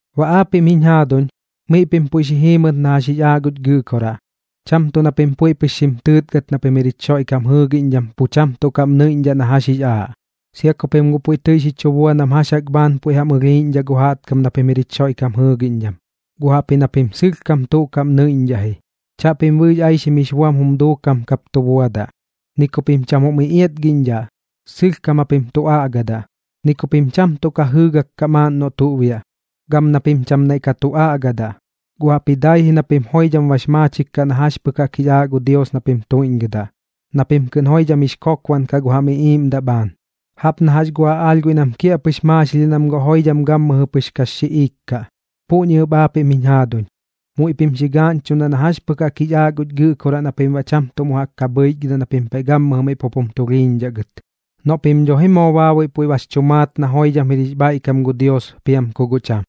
Baꞌ aapiꞌm jiñ jaaduñ, miꞌ pim puiꞌ xi jiimɨt na jax jix aaꞌ guch Gɨꞌkoraꞌ, cham tuꞌ na pim puiꞌ pɨx xim tɨɨtgat na pim jir jich Xoiꞌkam jɨɨgiꞌñdham pu cham tuꞌ kaꞌm nɨiꞌñdhaꞌ na jax jix aaꞌ, sia ku pim guꞌ puiꞌ tɨi xi chu bua nam jax jaꞌk bhaan puiꞌ jam ɨlhiiꞌñdhaꞌ gu jaꞌtkam na pim jir jich Xoiꞌkam jɨɨgiꞌñdham. Guꞌ jaꞌpji na pim sɨlhkam tuꞌ kaꞌm nɨiꞌñdhaꞌ ji. Chaꞌpim bɨɨx aixim jix buam jum duukam kap tu buadaꞌ, ni ku pim cham jum iꞌiatgiꞌñdhat, sɨlhkam japim tu aꞌgadaꞌ. Ni ku pim cham tuꞌ ka jɨɨgak kaꞌ maaꞌn noꞌ tuꞌ biaꞌ, gam na pim cham naiꞌ ka tu aꞌgadaꞌ. Guꞌ jaꞌpji dai ji na pim joidham bax maachik kaꞌ na jax pɨk jaꞌk jix aaꞌ gu Dios na pim tuiꞌñgɨdaꞌ, na pim kɨꞌn joidham jix kokbaꞌn kaꞌ gu jam iꞌiiꞌmdaꞌ bhaan, jaꞌp na jax gu aꞌaalh guiꞌ nam kiaꞌpɨx maaxilhiaꞌ nam guꞌ joidham gammɨjɨ pɨx kax xiꞌiik kaꞌ. Puꞌñi ɨp aapiꞌm jiñ jaaduñ, muiꞌ pim xi gaaꞌñchuꞌndaꞌ na jax pɨk jaꞌk jix aaꞌ guch Gɨꞌkoraꞌ na pim baꞌ cham mu jaꞌk ka bhɨichgɨdaꞌ na pim paiꞌ gammɨjɨ miꞌ pup jum tulhiiñdhaꞌ gɨt, noꞌ pim dho ji moo baabuiꞌ puiꞌ bax chu maat na joidham jir jix bhaiꞌkam gu Dios piam ku guꞌ cham.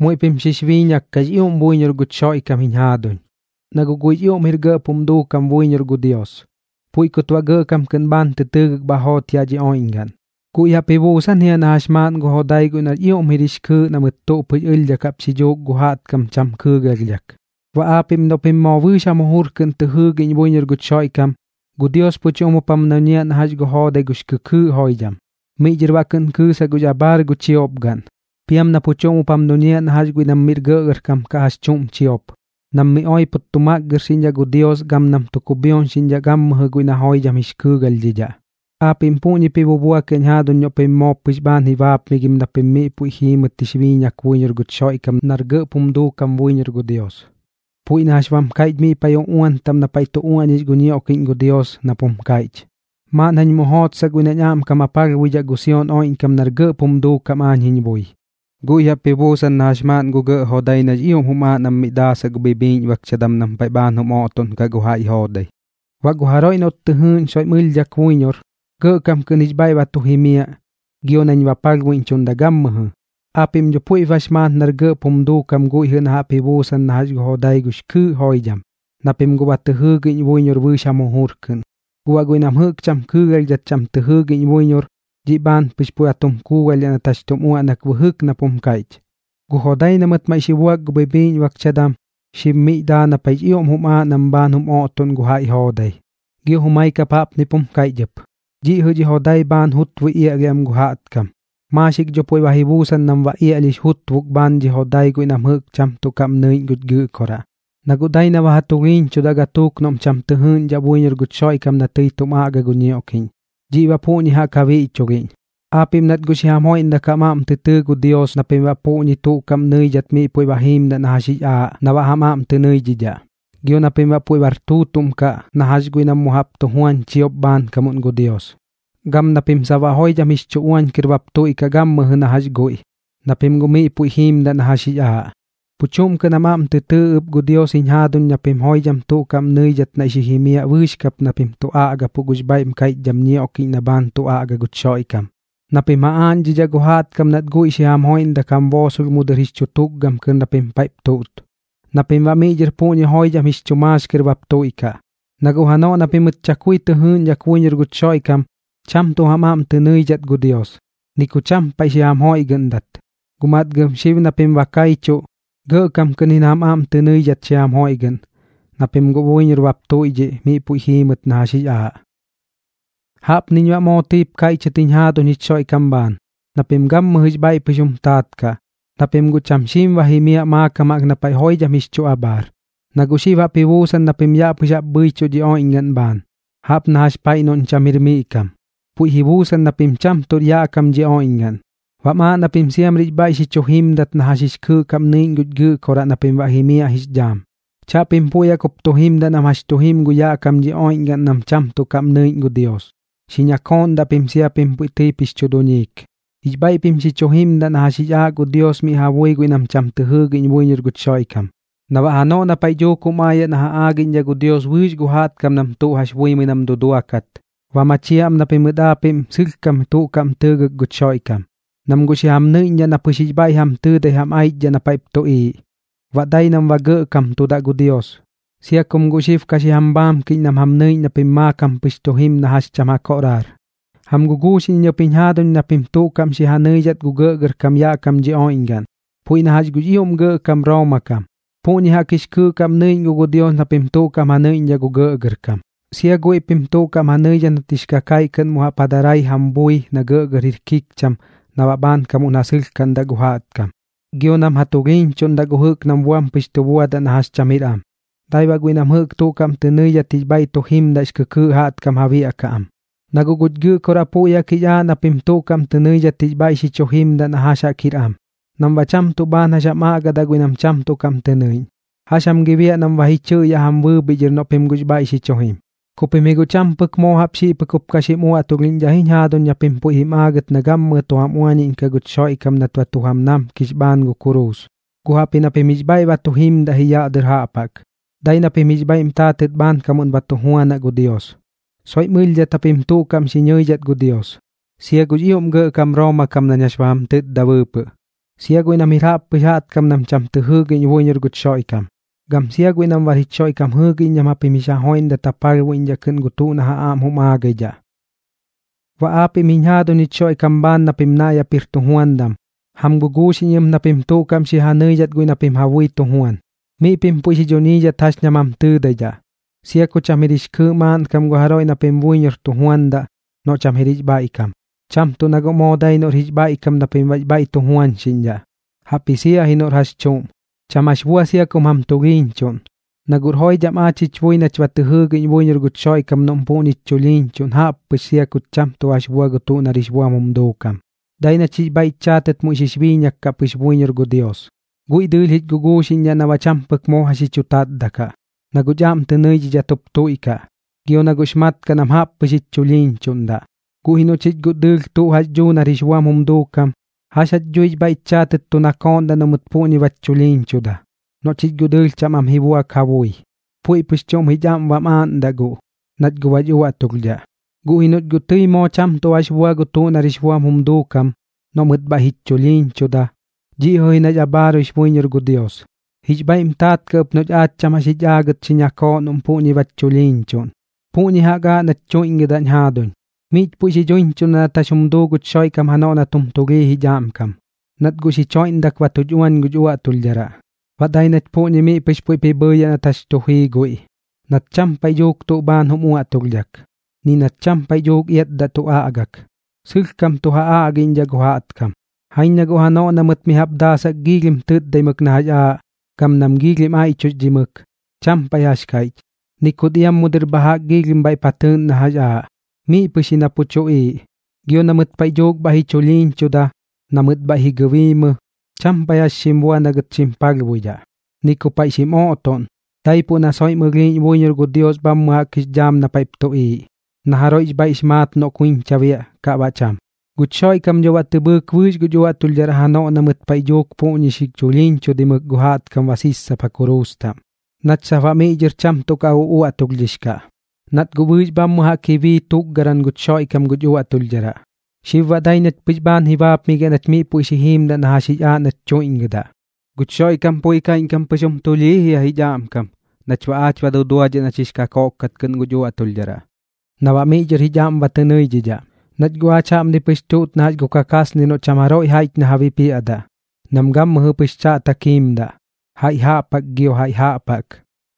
Muiꞌ pim xix biiñak kaꞌx ioꞌm buiñor guch Xoiꞌkam jiñ jaaduñ, na guꞌ guiꞌx ioꞌm jir gɇꞌp jum duukam buiñor gu Dios, puiꞌ kut baꞌ gɇꞌkam kɨꞌn bhaan tɨ tɨɨgɨk bha joot yaꞌ dhi oiꞌñgaꞌn. Guiꞌ jaꞌp ji buusan jia na jax maaꞌn gu jodai guiꞌ nax ioꞌm jir jix kɨɨꞌ na mɨt tuꞌ pɨx ɨlhdhak jaꞌp xi dhuuk gu jaꞌtkam cham kɨɨgalhdhak. Baꞌ aapiꞌm noꞌ pim moo bɨɨx jam jujur kɨꞌn tɨ jɨɨgiꞌñ buiñor guch Xoiꞌkam, gu Dios pu chuꞌm jup jam duñiaꞌ na jax gu joodai gux kɨkɨɨꞌ joidham, miꞌ dhɨr baꞌ kɨꞌn kɨɨsaꞌ gux abhaar gu chiopgaꞌn. Piam na pu chuꞌm jup jam duñiaꞌ na jax guiꞌ nam miꞌr gɇꞌgɇrkam kaꞌ jax chuꞌm chiop, nam miꞌ oipot tu makgɨrxiꞌñdhaꞌ gu Dios gam nam tu kubhioñxiꞌñdhaꞌ na gammɨjɨ guiꞌ na joidham jix kɨɨgalhdhidhaꞌ. Aapiꞌm puꞌñip ji bubuakiaꞌñ jaaduñ noꞌ pim moo pɨx bhaan ji baapmigim na pim miꞌ puiꞌ jiimɨt jix biiñak buiñor guch Xoiꞌkam nar gɇꞌp jum duukam buiñor gu Dios, puiꞌ na jax bam kaiꞌch miꞌ paiꞌ uꞌuan taꞌm na paiꞌ tu uaꞌñix gu ñioꞌkiꞌñ gu Dios nap jum kaiꞌch: Maaꞌn jañ mu jootsaꞌ guiꞌ nañ aꞌmkam ja palhbuidhaꞌ gu Sion oiꞌñkam nar gɇꞌp jum duukam aañ jiñ bui. Guiꞌ jaꞌp ji buusan na jax maaꞌn gu gɇꞌ jodai nax ioꞌm jum aaꞌ nam miꞌ daasaꞌ gu bhibhiiꞌñbakchadam nam paiꞌ bhaan jum oꞌtoꞌnkaꞌ gu jaiꞌ joodai. Baꞌ gu jaroiꞌ noꞌt soiꞌm ɨlhdhak tɨ jɨɨꞌñ buiñor, gɇꞌkam kɨꞌn jix bhaiꞌ ba tu jimiaꞌ gio nañ ba palhbuiꞌñchuꞌndaꞌ gammɨjɨ. Aapiꞌm dho puiꞌp bax maat nar gɇꞌp jum duukam guiꞌ jɨꞌ na jaꞌp ji buusan na jax gu jodai gux kɨɨꞌ joidham, na pim guꞌ ba tɨ jɨɨgiꞌñ buiñor bɨɨx jam jujur kɨꞌn. Guꞌ baꞌ guiꞌ nam jɨꞌk cham kɨɨgalhdhat cham tɨ jɨɨgiꞌñ buiñor, dhiꞌ bhaan pɨx puiꞌ ba tum kuugalhdhaꞌ nat jax tum uaꞌnak bɨjɨk nap jum kaiꞌch: Gu jodai na mɨt maiꞌ tɨi xi buak gu bhibhiiꞌñbakchadam, xib miꞌ daa na paiꞌx ioꞌm jum aaꞌ nam bhaan jum oꞌtoꞌn gu jaiꞌ joodai. Gio jumai kap jaꞌpnip jum kaiꞌch ɨp: Dhiꞌ jɨꞌ dhi jodai bhaan jutbui iaꞌlhiaꞌ am gu jaꞌtkam. Maaxik dho puiꞌ ba ji buusan nam ba iaꞌlhix jutbuk bhaan dhi jodai guiꞌ nam jɨꞌk cham tuꞌ kaꞌm nɨiꞌñ guch Gɨꞌkoraꞌ, na guꞌ dai na ba ja tulhiiñchudaꞌ gatuuk nam cham tɨ jɨɨꞌñdhaꞌ buiñor guch Xoiꞌkam na tɨi tum aꞌga gu ñioꞌkiꞌñ. Dhiꞌ baꞌ puꞌñi jaꞌk ja biꞌchulhiꞌñ. Aapiꞌm nat guꞌ xi jam joiꞌndak jam aꞌm tɨ tɨɨ gu Dios na pim baꞌ puꞌñi tuꞌ kaꞌm nɨidhat miꞌ puiꞌ jiimdaꞌ na jax jix aaꞌ na baꞌ jam aꞌm tɨ nɨidhidhaꞌ, gio na pim baꞌ puiꞌ bar tuutuꞌm kaꞌ na jax guiꞌ nam mu jaꞌp tu juandaꞌ chiop bhaankamuꞌn gu Dios, gam na pim sap baꞌ joidham jix chu uañ kɨr bap tuiꞌkaꞌ gammɨjɨ na jax guiꞌ, na pim guꞌ miꞌ puiꞌ jiimdaꞌ na jax jix aaꞌ. Pu chuꞌm kɨꞌn jam aꞌm tɨ tɨɨ ɨp gu Dios jiñ jaduuñ na pim joidham tuꞌ kaꞌm nɨidhat naiꞌ xi jimiaꞌ bɨɨx kap na pim tu aꞌgapuꞌ gux bhaiꞌm kaiꞌchdham ñioꞌkiꞌñ na bhaan tu aꞌga guch Xoiꞌkam, na pim ja aaꞌñdhidhaꞌ gu jaꞌtkam nat guiꞌ xi jam joiꞌndak jam boosolh mu dɨr jix chu tukgam tɨr na pim paiꞌp tuꞌt, na pim baꞌ miꞌ dhɨr puꞌñi joidham jix chu maax kɨr bap tuiꞌkaꞌ. Na guꞌ janoꞌ na pimɨt chakui tɨ jɨɨgiꞌñdhak buiñor guch Xoiꞌkam, cham tuꞌ jam aꞌm tɨ nɨidhat gu Dios, ni ku cham paiꞌ xi jam joiꞌgɨꞌndat. Guꞌ matgam xib na pim ba kaichuꞌ, gɇꞌkam kɨꞌn ji na jam aꞌm tɨ nɨidhidhat xi jam joiꞌgɨꞌn, na pim guꞌ buiñor bap tuiꞌdhiꞌ miꞌ puiꞌ jiimɨt na jax jix aaꞌ. Jaꞌpniñ baꞌ moo tɨip kaiꞌchɨt jiñ jaaduñ jich Xoiꞌkam bhaan, na pim gammɨjɨx bhaiꞌ pɨx jum taat kaꞌ, na pim guꞌ cham xiim ba jimiaꞌ maakam jaꞌk na paiꞌ joidham jix chu abhaar. Na guꞌ xib jaꞌp ji buusan na pim yaꞌ pɨx jaꞌp bhɨichuꞌ dhi oiꞌñgaꞌn bhaan, jaꞌp na jax paiꞌ noꞌñ cham jir miꞌ kam. Puiꞌ ji buusan na pim cham tuꞌr yaꞌ kam dhi oiꞌñgaꞌn, baꞌm aaꞌ na pim siamrix bhaiꞌ xi chu jimdat na jax jix kɨɨꞌ kaꞌm nɨiꞌñ guch Gɨꞌkoraꞌ na pim baꞌ jimiaꞌ jix dhaam. Chaꞌpim puiꞌ jaꞌk jup tu jimdaꞌ nam jax tu jim gu yaꞌ kam dhi oiꞌñgaꞌn nam cham tuꞌ kaꞌm nɨiꞌñ gu Dios. Xi ñakooꞌndaꞌ pim sia ku pim tɨi puiꞌp jix chu duñiik. Jix bhaiꞌ pim xi chu jimdaꞌ na jax jix aaꞌ gu Dios miꞌ ja bui guiꞌ nam cham tɨ jɨɨgiꞌñ buiñor guch Xoiꞌkam. Na baꞌ janoꞌ na paiꞌ dhuuk jum aayaꞌ na ja aagiꞌñdhaꞌ gu Dios bɨɨx gu jaꞌtkam nam tuꞌ jax buimɨi nam duduakat, ba machiaꞌ am na pimɨt aapiꞌm sɨlhkam tuꞌ kaꞌm tɨɨgɨk guch Xoiꞌkam, nam guꞌ xi jam nɨiꞌñdhaꞌ na pɨx jix bhaiꞌ jam tɨɨdai jam aichdhaꞌ na paiꞌp tuꞌiiꞌ. Baꞌ dai nam ba gɇꞌkamtudaꞌ gu Dios, sia kum guꞌ xib ka xi jam bhaamkiꞌñ nam jam nɨiꞌñ na pim maakam pɨx tu jim na jax cham ja koꞌraar. Jam guguuxiꞌñ iñ ɨp jiñ jaaduñ na pim tuꞌ kaꞌm xi ja nɨidhat gu gɇꞌgɇrkam yaꞌ kam dhi oiꞌñgaꞌn, puiꞌ na jax gux ioꞌm gɇꞌkam Rooma kam. Puꞌñi jaꞌk jix kɨɨꞌ kaꞌm nɨiꞌñ guꞌ gu Dios na pim tuꞌ kaꞌm ja nɨiꞌñdhaꞌ gu gɇꞌgɇrkam. Sia guiꞌ pim tuꞌ kaꞌm ja nɨidhat nat jix kakaiꞌ kɨꞌn mu jaꞌp ja darai jam bui na gɇꞌgɇr jir kikcham na baꞌ bhaankamuꞌn ja sɨlhkaꞌndaꞌ gu jaꞌtkam, gio nam ja tulhiiñchuꞌndaꞌ gu jɨꞌk nam buam pɨx tu buadaꞌ na jax cham jir am. Dai baꞌ guiꞌ nam tuꞌ kaꞌm tɨ nɨidhat jix bhaiꞌ tu jimdaꞌx kɨkɨɨꞌ jaꞌtkam ja biaꞌkaꞌ am. Na guꞌ guch Gɨꞌkoraꞌ puiꞌ jaꞌk jix aaꞌ na pim tuꞌ kaꞌm tɨ nɨidhat jix bhaiꞌ xi chu jimdaꞌ na jax jaꞌk jir am, nam baꞌ cham tuꞌ bhaan jax jam aꞌgadaꞌ guiꞌ nam cham tuꞌ kaꞌm tɨ nɨiꞌñ. ¿Jax jam gi biaꞌ nam ba ji chɨꞌyaꞌ jam bɨɨbhiꞌ dhɨr noꞌ pim guꞌx bhaiꞌ xi chu jim? Ku pim ji guꞌ cham pɨk moo jaꞌp xiꞌ pɨk jup ka xim uaꞌtulhiꞌñdhaꞌ ji jiñ jaaduñ na pim puiꞌ jim aagɨt na gammɨjɨ tu jam uañiꞌñkaꞌ guch Xoiꞌkam nat ba tu jam namkix bhaan gu kuruus, guꞌ jaꞌpji na pim jix bhaiꞌ ba tu jimdaꞌ ji yaꞌ dɨr jaꞌp jaꞌk, dai na pim jix bhaiꞌm taatɨt bhaankamuꞌn ba tu juanaꞌ gu Dios. Soiꞌm ɨlhdhat japim tuꞌ kaꞌm xi ñɨidhat gu Dios, sia gux ioꞌm gɇꞌkam Rooma kam nañ jax ba jam tɨtda bɨɨpɨꞌ, sia guiꞌ nam jir jaꞌppɨx jaꞌtkam nam cham tɨ jɨɨgiꞌñ buiñor guch Xoiꞌkam, gam sia guiꞌ nam bar jich Xoiꞌkam jɨɨgiꞌñdham japim jix ja joiꞌndat ja palhbuidhat kɨꞌn gu tuꞌ na ja aꞌm jum aagaidhaꞌ. Baꞌ aapiꞌm jiñ jaaduñ jich Xoiꞌkam bhaan na pim naiꞌ jaꞌp jir tujuandam, jam guguuxiꞌñ iñ ɨp na pim tuꞌ kaꞌm xi ja nɨidhat guiꞌ na pim ja bui tu juan. Miꞌ pim puiꞌ xi dhuñiidhat jax ña jam tɨɨdaidhaꞌ, sia ku cham pɨk jir kɨɨꞌ maaꞌnkam gu jaroiꞌ na pim buiñor tu juandaꞌ noꞌ cham jir jix bhaiꞌkam. Cham tuꞌ na guꞌ moo dai noꞌr jix bhaiꞌkam na pim baꞌx bhaiꞌ tu juañxiꞌñdhaꞌ, jaꞌpji sia ji noꞌr jax chuꞌm. Cham jax bua sia kum jam tulhiiñchuꞌn, na guꞌr joidham aach jich bui nach ba tɨ jɨɨgiꞌñ buiñor guch Xoiꞌkam noꞌm puꞌñich chulhiiñchuꞌn jaꞌp pɨx sia kuch cham tuꞌ jax bua gu tuꞌ nar jix buam jum duukam, dai nach jix bhaiꞌch chaatɨt muiꞌ xix biiñak kaꞌ pɨx buiñor gu Dios. Guiꞌ dɨɨlh jich guguuxiꞌñdhaꞌ na baꞌ cham pɨk moo jax xi chu tatdaꞌ kaꞌ, na guꞌch aꞌm tɨ nɨidhat jup tuiꞌkaꞌ, gio na guꞌx mat kaꞌ nam jaꞌp pɨx jich chulhiiñchuꞌndaꞌ. Guꞌ ji noꞌ chich guꞌ dɨɨlh tuꞌ jax dhuu nar jix buam jum duukam, ¿jax jach dhuix bhaiꞌch chaatɨt tu nakooꞌndaꞌ noꞌ mɨt puꞌñi bach chulhiiñchuda, noꞌ chich guꞌ dɨɨlh cham am ji buak ja bui? Puiꞌ pɨx chuꞌm jich aꞌm bam aaꞌndaꞌ guꞌ, nach guꞌ bach uaꞌtulhdhaꞌ. Guꞌ ji noꞌch guꞌ tɨi moo cham tuꞌ jax bua gu tuꞌ nar jix buam jum duukam, noꞌ mɨt bhaiꞌ jich chulhiiñchuda, dhiꞌ jɨꞌ ji nax abhaaruix buiñor gu Dios, jix bhaiꞌm taat kaꞌ ɨp noꞌch aach cham jax jich aagɨt xi ñakooꞌ noꞌm puꞌñi bach chulhiiñchuꞌn. Puꞌñi jaꞌk aaꞌ nach tuiꞌñgɨdaꞌñ jaaduñ, miꞌch puiꞌp xi chu daaꞌñchuꞌndaꞌ nat jax jum duu guch Xoiꞌkam janoꞌ nat jum tulhii jich aꞌmkam, nat guꞌ xich joiꞌndak ba tuch uañ guch uaꞌtulhdharaꞌ. Dai baꞌ nach puꞌñi miꞌ pɨx puiꞌp ji bhɨɨyaꞌ nat jax tu jii guiꞌ, nat cham paiꞌ dhuuk tuꞌ bhaan jum uaꞌtulhdhak, ni nat cham paiꞌ dhuuk iatdaꞌ tu aꞌgak, sɨlhkam tu ja aꞌgiꞌñdhaꞌ gu jaꞌtkam. Jaiñ na guꞌ janoꞌ na mɨt mi jaꞌp daasak giilhim tɨtdaimɨk na jax aaꞌ, gam nam giilhim aiꞌchuxdhimɨk, cham paiꞌ jax kaiꞌch, ni kut iam mu dɨr bha jaꞌk giilhim bhaiꞌp ja tɨɨꞌn na jax aaꞌ, miꞌ pɨx ji na pu tuꞌiiꞌ. Gio na mɨt paiꞌ dhuuk bhaiꞌ ji chulhiiñchuda, na mɨt bhaiꞌ ji gɨbiimɨ, cham paiꞌ jax xim bua na gɨt xim palhbuidhaꞌ, ni ku paiꞌ xim oꞌtoꞌn, daipuꞌ na soiꞌ xim ɨlhiiꞌñ buiñor gu Dios bhammɨ jaꞌk jix dhaam na paiꞌp tuꞌiiꞌ, na jaroiꞌx bhaiꞌx maat noꞌ kuiñcha biaꞌ kaꞌ baꞌ cham. Guch Xoiꞌkam dho baꞌ tɨ bhɨɨk bɨɨx guch uaꞌtulhdharaꞌ janoꞌ na mɨt paiꞌ dhuuk puꞌñi xi chulhiiñchudaimɨk gu jaꞌtkam ba sissapa kuruus taꞌm, nach sap baꞌ miꞌ dhɨr cham tuꞌ ka uꞌuaꞌtulhdhix kaꞌ, nat guꞌ bɨɨx bhammɨ jaꞌk ji bii tukgaran guch Xoiꞌkam guch uaꞌtulhdharaꞌ. Xib baꞌ dai nach pɨx bhaan ji baapmigiaꞌ nach miꞌ puiꞌ xi jiimdaꞌ na jax jix aaꞌ nach tuiꞌñgɨdaꞌ. Guch Xoiꞌkam puiꞌ kaiꞌñkam pɨx jum tulhii jia jich aꞌmkam nach baꞌ aach ba duduadhiaꞌ nach jix kakoꞌk kat kɨꞌn guch uaꞌtulhdharaꞌ, na baꞌ miꞌ dhɨr jich aꞌm ba tɨ nɨidhidhaꞌ. Nach guꞌ aach jaꞌpni pɨx tuꞌt na jax gu kakaasnir noꞌ cham jaroiꞌ jaiꞌch na ja bipiaꞌdaꞌ, nam gammɨjɨ pɨx chaꞌtak jiimdaꞌ, jaiꞌ jaꞌp jaꞌk gio jaiꞌ jaꞌp jaꞌk.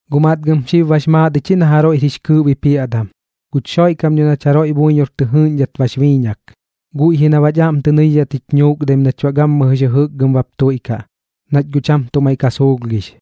Guꞌ matgɨm xib bax maat ich ji na jaroiꞌr jix kɨɨꞌ bipiaꞌdam, guch Xoiꞌkam dho nach jaroiꞌ buiñor tɨ jɨɨꞌñdhat bax biiñak. Guiꞌ ji na baꞌch aꞌm tɨ nɨidhidhat jich nuukdaim nach baꞌ gammɨjɨx jɨjɨkgɨm bap tuiꞌkaꞌ, nach guꞌ cham tuꞌ maiꞌ ka suulhgix.